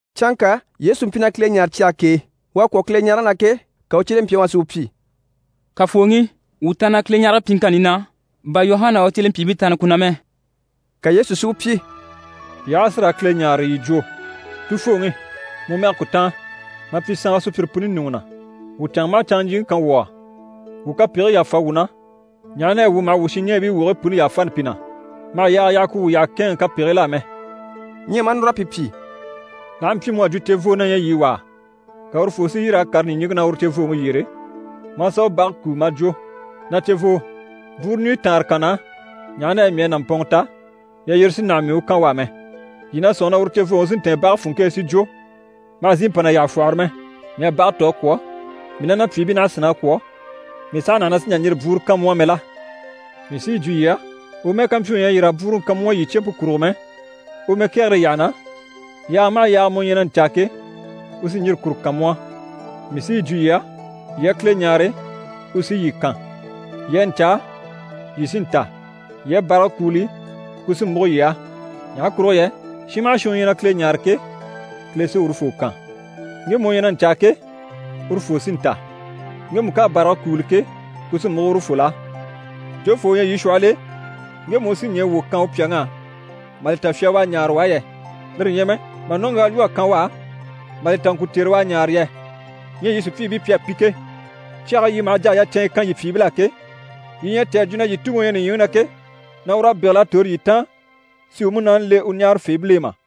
Canŋka Yesu mpyi na Kile ɲáare cyage k'e. U à kwɔ̀ Kileɲarege na ke, ka u cyelempyaŋi wà si u pyi: «Kafooŋi, wuu taanna Kileɲarege pyiŋkanni na, bà Yuhana a u cyelempyiibii taanna ku na mɛ.» Ka Yesu si u pyi: «Yii aha a si raa Kile ɲáare, yii jwo: “Tufooŋi, mu mɛge ku táan. Ma pyi saanwa sùpyire puni ɲùŋɔ na. Wuu canŋa maha canŋa ɲjyìŋi kan wuu á. Wuu kapegigii yàfa wuu na, ɲaha na yɛ wuu maha wuu shinɲɛɛbii wogigii puni yàfani pi na. Ma hà yaaga yaha ku wuu yyaha kɛ̂ɛnŋɛ kapegigil'á mɛ.”» Ɲyɛ maa núr'a pi pyi: «L'aha mpyi mu à jwo cevoo na ɲyɛ yii wà á, ka urufoo si yîr'a kàre ɲìɲiŋke na uru cevooŋi yyére, maa sà u bage kúu mà jwo “Na cevoo, bwúuru ɲùɲyi taanre kan na á, ɲaha na yɛ mii à nàmpɔnŋɔ ta, yalyire sí naha mii u kan u á mɛ.” Yii na sɔ̂nŋi na uru cevooŋi sí n‑tɛ̀ɛn bage funŋke e si jwo “Ma hà zìi mpa na yyaha fwɔ́hɔrɔ mɛ. Mii à bage tò a kwɔ̀, mii ná na pyìibii naha a sínn'a kwɔ̀, mii saha naha na sì n-jà n-yîri bwúuru kan mu á mɛ” la? Mii sí yi jwo yii á, u mɛ́ɛ ká mpyi u ɲyɛ a yîr'a bwúuruŋi kan mu á yii cempe kurugo mɛ, u mɛkɛgere yyaha na, yaaga maha yaaga mu ɲyɛ na ɲcaa ke, u sí n‑yîri kuru kan mu á. Mii sí yi jwo yii á, yii a Kile ɲáare, u sí yii kan, yii a ɲcaa, yii sí n‑ta, yii a bàrage kúuli, ku sí múgo yii á. Ɲaha kurugo yɛ shin maha shin u ɲyɛ na Kile ɲáare ke, Kile sí urufoo kan. Ŋgemu u ɲyɛ na ɲcaa ke, urufoo sí n-ta. Ŋgemu ká a bàrage kúuli ke, ku sí múgo urufol'á. Jofoo u ɲyɛ yii shwɔhɔl'e, ŋgemu u sí ɲɛɛ wwò kan u pyàŋ'á mà li ta fya u à ɲáare u á yɛ? Lire ɲyɛ mɛ, mà nɔ́ŋgyaa lwɔ́ a kan u á, mà li ta ŋkùcere u à ɲáare yɛ? Ɲyɛ yii sùpyiibii pi à pi ke, cyage e yii maha jà a yacɛnɲyɛ kan yii pyìibil'á ke, yii ɲyɛ a cè a jwo na yii Tuŋi u ɲyɛ nìɲyiŋi na ke, na ur'à bégel'a tòro yii taan si u Munaani le u ɲáarafeebil'e mà?»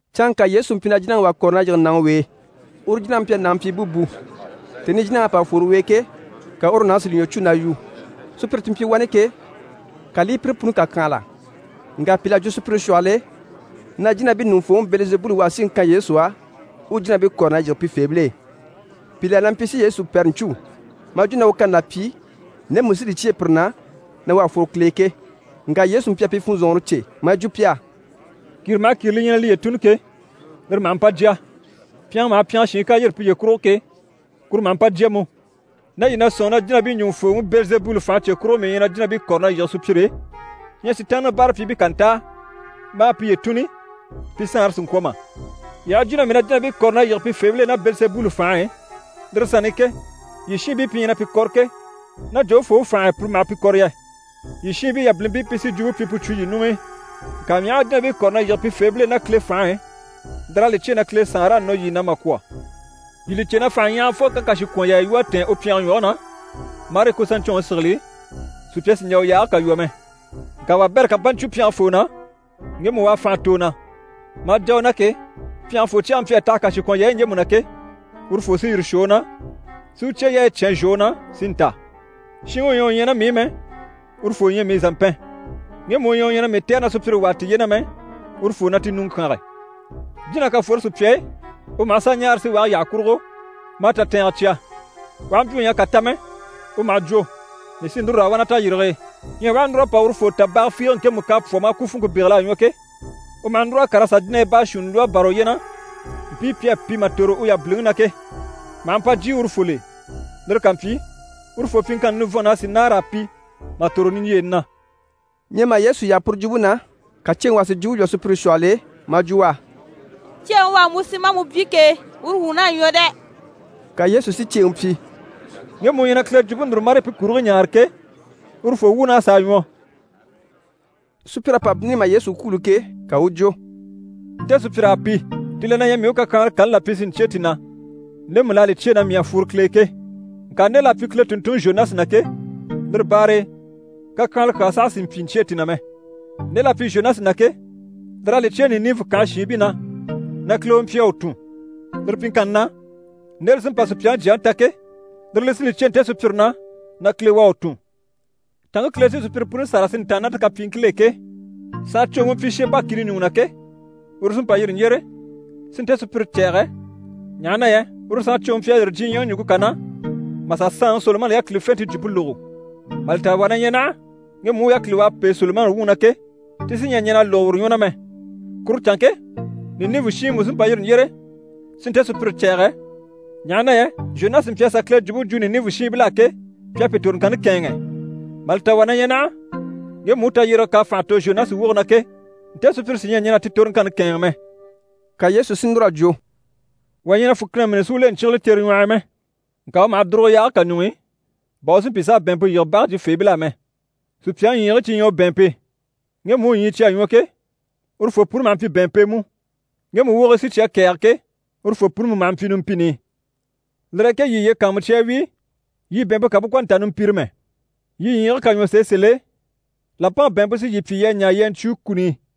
Canŋka Yesu mpyi na jínaŋi wà kɔ̀re na yige nàŋi w'e, uru jínaŋi mpyi a nàŋi pyi búbu. Tèni i jínaŋ'à pa fworo u e ke, ka uru nàŋi si li ɲwɔ cû na yu. Sùpyire ti mpyi wani ke, ka li i pi puni kàkyanhala. Ŋka pìl'à jwo sùpyire shwɔhɔl'e, na jínabii ɲùŋufooŋi Bɛlizebuli u à síŋi kan Yesu á, u u jínabii kɔ̀re na yige pifeebil'e. Pìi la na mpyi si Yesu pɛrɛ ɲcû, maa jwo na u kani là pyi ndemu li sí li cyêe pire na na u à fworo Kile e ke. Ŋka Yesu mpyi a pi funzɔnŋɔre cè maa yi jwo pi á: «Kìre maha kìre li ɲyɛ na liye tùnni ke, lire maha mpa jya. Pyɛngɛ maha pyɛngɛ shiin ká yîri piye kurugo ke, kuru maha mpa jya mú. Ná yii na sɔ̂nŋi na jínabii ɲùŋufooŋi Bɛlizebuli fànhe cye kurugo mii ɲyɛ na jínabii kɔ̀re na yige sùpyire e, ɲyɛ Sitaanniŋi báarapyiibii ká ntáa maa piye tùnni, pi saanre sì n‑kwɔ̀ mà? Yii aha jwo na mii na jínabii kɔ̀re na yige pifeebil'e ná Bɛlizebuli fànhe e, lire sanni i ke, yii shiinbii pi ɲyɛ na pi kɔ̀re ke, ná jofoo u fànhe e pire maha pi kɔ̀re yɛ? Yii shiinbii yabilimpii pi sí jwumpe pyi pu cwo yii ɲuŋ'i. Ŋka mii aha a jínabii kɔ̀re na yige pifeebil'e ná Kile fànhe e, lir'à li cyêe na Kile Saanre à nɔ yii na mà kwɔ̀. Yii li cè na fànhaɲyahagafoo ká kàshikwɔnyaaya lwɔ́ a tɛ̀ɛn u pyɛnge ɲwɔge na marii ku saɲcwɔnŋi sigili, sùpya sì n‑jà u yaage kà lwɔ́ mɛ. Ŋka wabɛrɛ ká mpa ɲcwo pyɛngefoo na, ŋgemu u à fànha tò u na, maa jà u na ke, pyɛngefoo cyɛge mpyi a taha kàshikwɔnyaayi ɲjemu na ke, urufoo sí yire shwɔ u na, si u cyeyaayi cyán zhwɔ u na, si ntáa. Shinŋi u ɲyɛ u ɲyɛ ná mii i mɛ, urufoo ɲyɛ mii zàmpɛn, ŋgemu u ɲyɛ u ɲyɛ na mii tɛ̀re na sùpyire wàa tiye na mɛ, urufoo na ti ɲùŋɔ kyánge. Jína ká fworo sùpya e, u maha sà ɲaara síwage yyaha kurugo, maa tatɛɛngɛ cya. U aha mpyi u ɲyɛ a kà ta mɛ, u maha jwo “Mii sí núru raa wà na tayirige e.” Ɲyɛ u aha núr'a pa urufoo ta baga fiige ŋkemu k'à pwɔ́ maa ku funŋke bégel'a ɲwɔ ke, u maha núr'a kàr'a sà jínahii baashuunni lwɔ́ a bâra uye na, mpii pi à pi mà tòro u yabiliŋi na ke, maha mpa jyè urufol'e. Lire ká mpyi, urufoo pyiŋkanni nivɔnn'a sì nâara a pi mà tòro niɲjyeeni na.» Ɲyɛ mà Yesu yaha puru jwumpe na, ka ceeŋi wà si jwumpe lwɔ́ sùpyire shwɔhɔl'e maa jwo u á: «Ceeŋi u à mu si maa mu byé ke, uru wuun'à ɲwɔ dɛ!» Ka Yesu si ceeŋi pyi: «Ŋgemu u ɲyɛ na Kile jwumpe núru, marii pu kurigii ɲaare ke, urufoo wuun'à sàa ɲwɔ.» Sùpyir'à pa bínni mà Yesu kwûulo ke, ka u u jwo: «Nte sùpyir'à pi. Ti la na ɲyɛ mii u kakyanhala kani là pyi si ɲcyêe ti na ndemu l'à li cyêe na mii à fworo Kile e ke. Ŋka nde l'à pyi Kile tùnntunŋi Zhonasi na ke, lire baare e kakyanhala kyaa saha sì n‑pyi n‑cyêe ti na mɛ. Nde l'à pyi Zhonasi na ke, lir'à li cyêe Ninive kànhe shiinbii na na Kile u mpyi a u tun. Lire pyiŋkanni na, nde li sí n‑pa Supyaŋi Jyaŋi ta ke, lire li sí li cyêe nte sùpyire na na Kile u à u tun. Canŋke Kile sí sùpyire puni sâra si ntàanna ná ti kapyiiŋkil'e ke, saancwoŋi u mpyi Sheba kìni ɲùŋɔ na ke, uru sí n‑pa n‑yîri n‑yyére, si nte sùpyire cɛ̂ɛgɛ, ɲaha na yɛ uru saancwoŋi mpyi a yîri diɲyɛŋi ɲùŋke kà na, mà sà saanŋi Solomani yákilifente jwumpe lógo. Mà li ta wà na ɲyɛ naha, ŋgemu u yákili u à pêe Solomani wuŋi na ke, ti sí ɲyɛ a ɲɛn'a lógo uru ɲwɔ na mɛ. Kuru canŋke, Ninive shiinbii mú sí n‑pa n‑yîri n‑yyére, si nte sùpyire cɛ̂ɛgɛ, ɲaha na yɛ Zhonasi mpyi a sà Kile jwumpe jwo Ninive shiinbil'á ke, pi à pi toroŋkanni kɛ̂ɛnŋɛ. Mà li ta wà na ɲyɛ naha, ŋgemu u tayyérege k'à fànha tò Zhonasi woge na ke, nte sùpyire sí ɲyɛ a ɲɛn'a ti toroŋkanni kɛ̂ɛnŋɛ mɛ.» Ka Yesu si núr'a jwo: «Wà ɲyɛ na fùkina mîni si u le ɲcyígile cere ɲwɔh'i mɛ. Ŋka u maha dùrugo yaage kà ɲuŋ'i, bà u si mpyi s'a bɛ̀ɛnmpe yige bage jyifeebil'á mɛ. Sùpyaŋi ɲyiigii cyi ɲyɛ u bɛ̀ɛnmpe. Ŋgemu u ɲyii cyi à ɲwɔ ke, urufoo puni maha mpyi bɛ̀ɛnmpe e mú. Ŋgemu wogigii sí cyi à kɛ̀ɛge ke, urufoo puni mú maha mpyi numpini i. Lire e ke yii yiye kàanmucya a wíi, yii bɛ̀ɛnmpe kà bú ŋkwɔ̀ nta numpire mɛ. Yii ɲyiigii ká ɲwɔ sèe sèl'e, làmpaŋi bɛ̀ɛnmpe sí yii pyi yii a ɲaa yii a ɲcwúu kuni i.»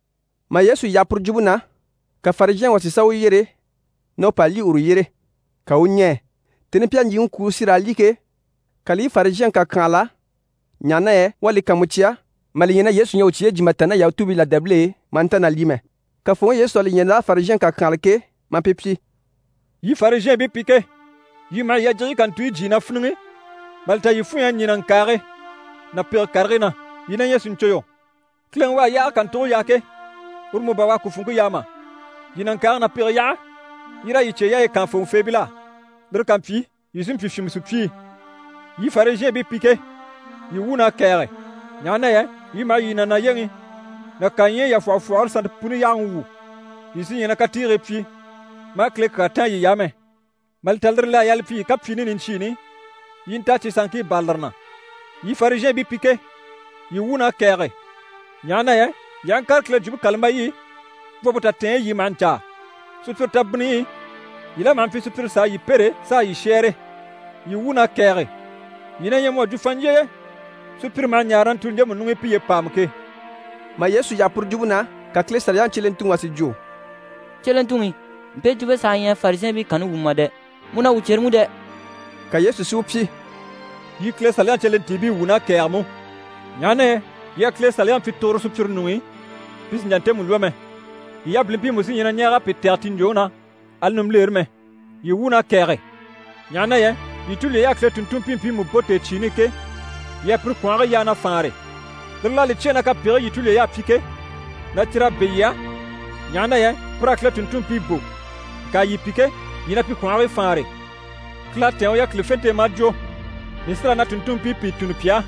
Mà Yesu yaha puru jwumpe na, ka Farizhɛnŋi wà si sà u yyere na u pa lyî uru yyére, ka u u ɲɛɛ. Tèni i pi à ɲjyìŋi kwûulo si raa lyî ke, ka li i Farizhɛnŋi kàkyanhala, ɲaha na yɛ u à li kàanmucya mà li ɲya na Yesu ɲyɛ a u cyeyi jyè mà tàanna ná Yahutuubii làdaabil'e, maa nta na lyî mɛ. Kafooŋi Yesu à li ɲya l'à Farizhɛnŋi kàkyanhala ke, maa pi pyi: «Yii Farizhɛɛnbii pi ke, yii maha yii yajigiyi kàntuyi jyíi na fíniŋi, mà li ta yii funɲy'à ɲî nàŋkaage ná pege karigii na. Yii na ɲyɛ sìɲconyɔ! Kileŋi u à yaage kàntuge yaa ke, uru mú bà u à ku funŋke yaa mà? Yii nàŋkaage ná pege yaha, yii raa yii cyeyaayi kaan fòŋɔfeebil'á. Lire ká mpyi, yii sí n‑pyi fyìnmɛ sùpyii. Yii Farizhɛɛnbii pi ke, yii wuun'à kɛ̀ɛge! Ɲaha na yɛ yii maha yii nànayeŋi ná kaɲyɛyi yafwɔhɔfwɔhɔre sannte puni yáhaŋi wwû, yii sí ɲyɛ na katiigii pyi, maa Kile kyaa táan yiy'á mɛ. Mà li ta lire l'à yaa li pyi yii kapyiini niɲcyiini, yii i nta a cyi sanŋkii bâra lire na. Yii Farizhɛɛnbii pi ke, yii wuun'à kɛ̀ɛge! Ɲaha na yɛ yii aha ŋkàre Kile Jwumpe kàlambayi i, bwompe tatɛɛnyi yii maha ɲcaa. Sùpyire tabinniyi i yii la maha mpyi sùpyire s'a yii pêre s'a yii shɛ́ɛre. Yii wuun'à kɛ̀ɛge! Yii na ɲyɛ mu à jwo fanɲjyeye, sùpyire maha ɲaare na ntùuli ɲjemu ɲuŋ'i piye pàama ke.» Mà Yesu yaha puru jwumpe na, ka Kile Saliyaŋi cyelentuŋi wà si jwo: «Cyelentuŋi, mpe jwumpe saha ɲyɛ Farizhɛɛnbii kanni wumɔ mà dɛ! Mu na wuu cyere mú dɛ!» Ka Yesu si u pyi: «Yii Kile Saliyaŋi cyelentiibii wuun'à kɛ̀ɛge mú, ɲaha na yɛ yii à Kile Saliyaŋi pyi tuguro sùpyire ɲuŋ'i, pi sì n‑jà ntemu lwɔ́ mɛ. Yii yabilimpii mú sí ɲyɛ na ɲɛɛg'a pi tɛ̀gɛ ti ɲjwòŋi na, ali nimbilere mɛ. Yii wuun'à kɛ̀ɛge! Ɲaha na yɛ yii tulyey'à Kile tùnntunmpii mpiimu bò tèecyiini i ke, yii à pire kwɔ̀nhigii yaa na faanre. Lire l'à li cyêe na kapegigii yii tulyey'à pyi ke, na cyir'à bɛ̂ yii á, ɲaha na yɛ pir'à Kile tùnntunmpii bò. Ŋka yii pi ke, yii na pi kwɔ̀nhigii faanre. Kile à tɛ̀ɛn u yákilifente e maa jwo “Mii sí raa na tùnntunmpii pìi tunni pi á,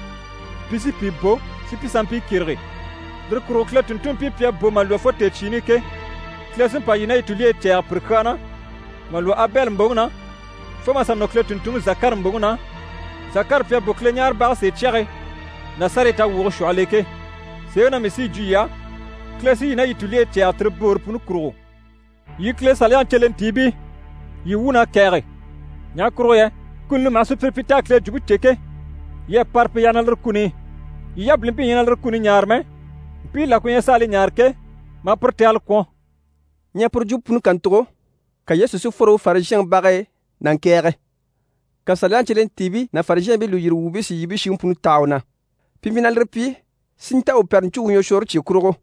pi sí pìi bò si pi sanmpii kyérege.” Lire kurugo Kile tùnntunmpii pi à bò mà lwɔ́ fo tèecyiini i ke, Kile sí n‑pa yii ná yii tulyeyi cɛ̂ɛgɛ pire kyaa na, mà lwɔ́ Abɛli mbòŋi na, fo mà sà nɔ Kile tùnntunŋi Zakari mbòŋi na, Zakari pi à bò Kileɲaarebage sèecyage ná sárayi tawwuge shwɔhɔl'e ke. Sèeŋi na mii sí yi jwo yii á, Kile sí yii ná yii tulyeyi cɛ̂ɛgɛ tire boore puni kurugo. Yii Kile Saliyaŋi cyelentiibii, yii wuun'à kɛ̀ɛge! Ɲaha kurugo yɛ kuni li maha sùpyire pyi t'à Kile jwumpe cè ke, yii à para pi yaha lire kuni i. Yii yabilimpii ɲyɛ na lire kuni ɲaare mɛ, mpii la ku ɲyɛ s'a li ɲaare ke, maa pire tɛgɛlɛ kwɔ̀n.» Ɲyɛ puru jwumpe puni kàntugo, ka Yesu si fworo uru Farizhɛnŋi bage e na ŋkɛ̀ɛge. Ka Saliyaŋi cyelentiibii ná Farizhɛɛnbii lùyiri wuubii si yibiyi shiŋi puni taha u na. Pi mpyi na lire pyi si nta u pɛrɛ ɲcû u ɲwɔshwɔɔre cye kurugo.